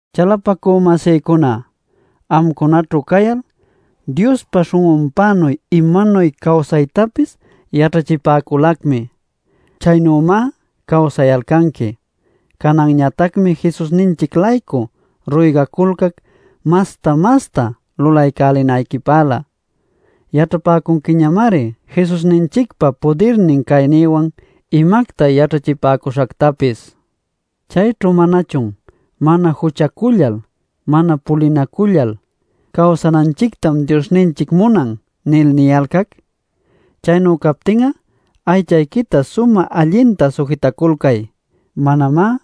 Chalapacü-masïcuna, amcunaćhu cayal, Diospa śhun'unpänuy imanuy cawsaytapis yaćhachipäculacmi. Chaynümá cawsayalcanqui. Cananñatacmi Jesusninchic-laycu ruygaculcac masta-masta lulanayquipälä. Yaćhapäcunquiñamari Jesusninchicpa pudirnin caynïwan imacta yaćhachipäcuśhactapis. Chayćhu ¿manachun “Mana juchacullal, mana pulinacullal cawsananchictam Diosninchic munan” nil niyalcac? Chaynu captin'a, aychayquita sumä allinta sujitaculcay; manamá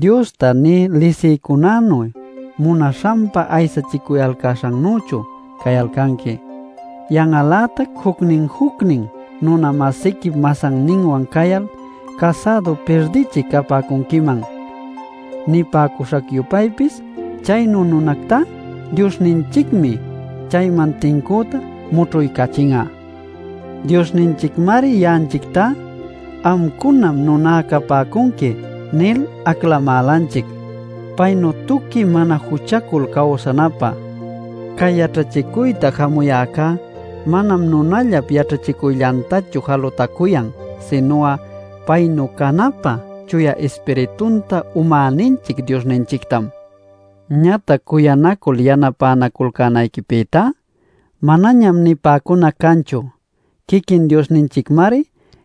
Diosta nï lisïcunänu munaśhanpa aysachicuyalcäśhancänüchu cayalcanqui. Yan'al-lätac jucnin-jucnin nuna-masiquip masanninwan cayal casädu pirdichï capäcunquiman. Nipäcuśhac-yupaypis chaynu nunactá Diosninchicmi chayman tincüta mućhuycachin'a. Diosninchicmari ya'anchictá “Amcunam nuná capäcunqui” nil aclamälanchic, paynuy tuqui mana juchacul cawsanapä. Cay yaćhachicuyta jamuyäcá manam nunallap yaćhachicuyllantachu jalutacuyan, sinu'a paynu canapä Chuya Ispiritunta umäninchic Diosninchictam. Ñatac cuyanacul yanapänaculcänayquipïtá, manañam nipäcunac canchu. Quiquin Diosninchicmari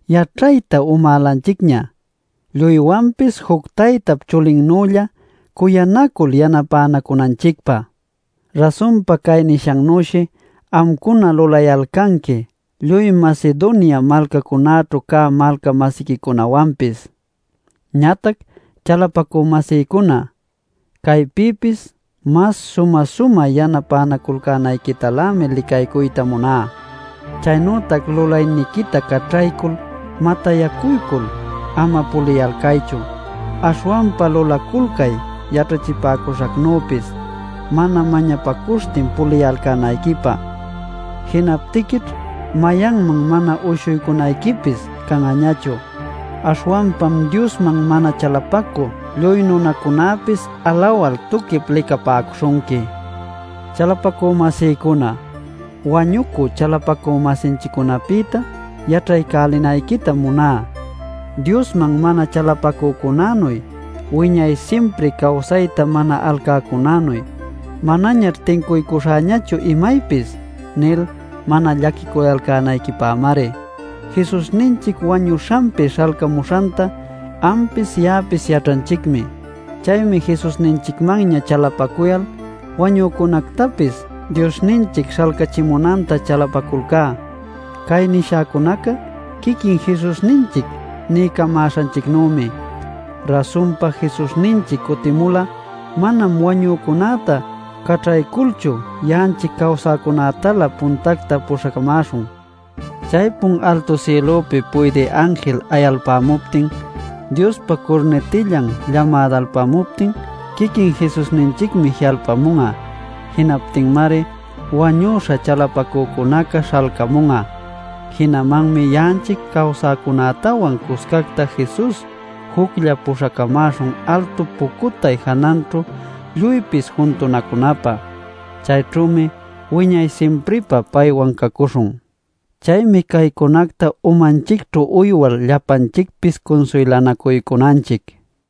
yaćhayta umälanchicña lluywanpis juc taytap chulinnülla cuyanacul yanapänacunanchicpä. Rasunpa cay nishannüshi amcuna lulayalcanqui lluy Macedonia malcacunäćhu cä malca-masiquicunawanpis. Ñatac, chalapacü-masïcuna, caypïpis mas sumä-sumä yanapänaculcänayquitalämi licaycuyta muná. Chaynütac lulayniquita caćhaycul matayyacuycul ama puliyalcaychu. Aśhwanpa lulaculcay yaćhachipäcuśhacnüpis mana mañapacuśhtin puliyalcänayquipä. Jinaptiquićh mayanman mana uyshuycunayquipis can'añachu, aśhwanpam Diosman mana chalapacü lluy nunacunäpis alawal tuquip licapäcuśhunqui. Chalapacü-masïcuna, wañucü chalapacü-masinchiccunapïta yaćhaycälinayquitam muná Diosman mana chalapacücunänuy, wiñay simpri cawsayta mana alcäcunänuy “Manañaćh tincuycuśhäñachu imaypis” nil mana llaquiculcänayquipämari. Jesusninchic wañüśhanpi śhalcamuśhanta ampis ya'apis yaćhanchicmi. Chaymi Jesusninchicmanña chalapacuyal wañücunätäpis Diosninchic śhalcachimunanta chalapaculcá. Cay nishäcunacá quiquin Jesusninchic niycamäśhanchicnümi. Rasunpa, Jesusninchic cutimul'a manam wañücunäta caćhayculchu ya'anchic cawsäcunätalä puntacta puśhacamäśhun. Chaypun altu sïlupi puydï anjil ayalpämuptin, Diospa curnitillan llamadalpämuptin, quiquin Jesusninchicmi ji'alpamun'a. Jinaptinmari wañüśha chalapacücunaca śhalcamun'a. Jinamanmi ya'anchic cawsäcunätawan cuscacta Jesus juclla puśhacamäśhun altu pucutay jananćhu lluypis juntunacunapä. Chayćhümi wiñay simpripä paywan cacuśhun. Chaymi caycunacta umanchicćhu uywal llapanchicpis cunsuylanacuycunanchic.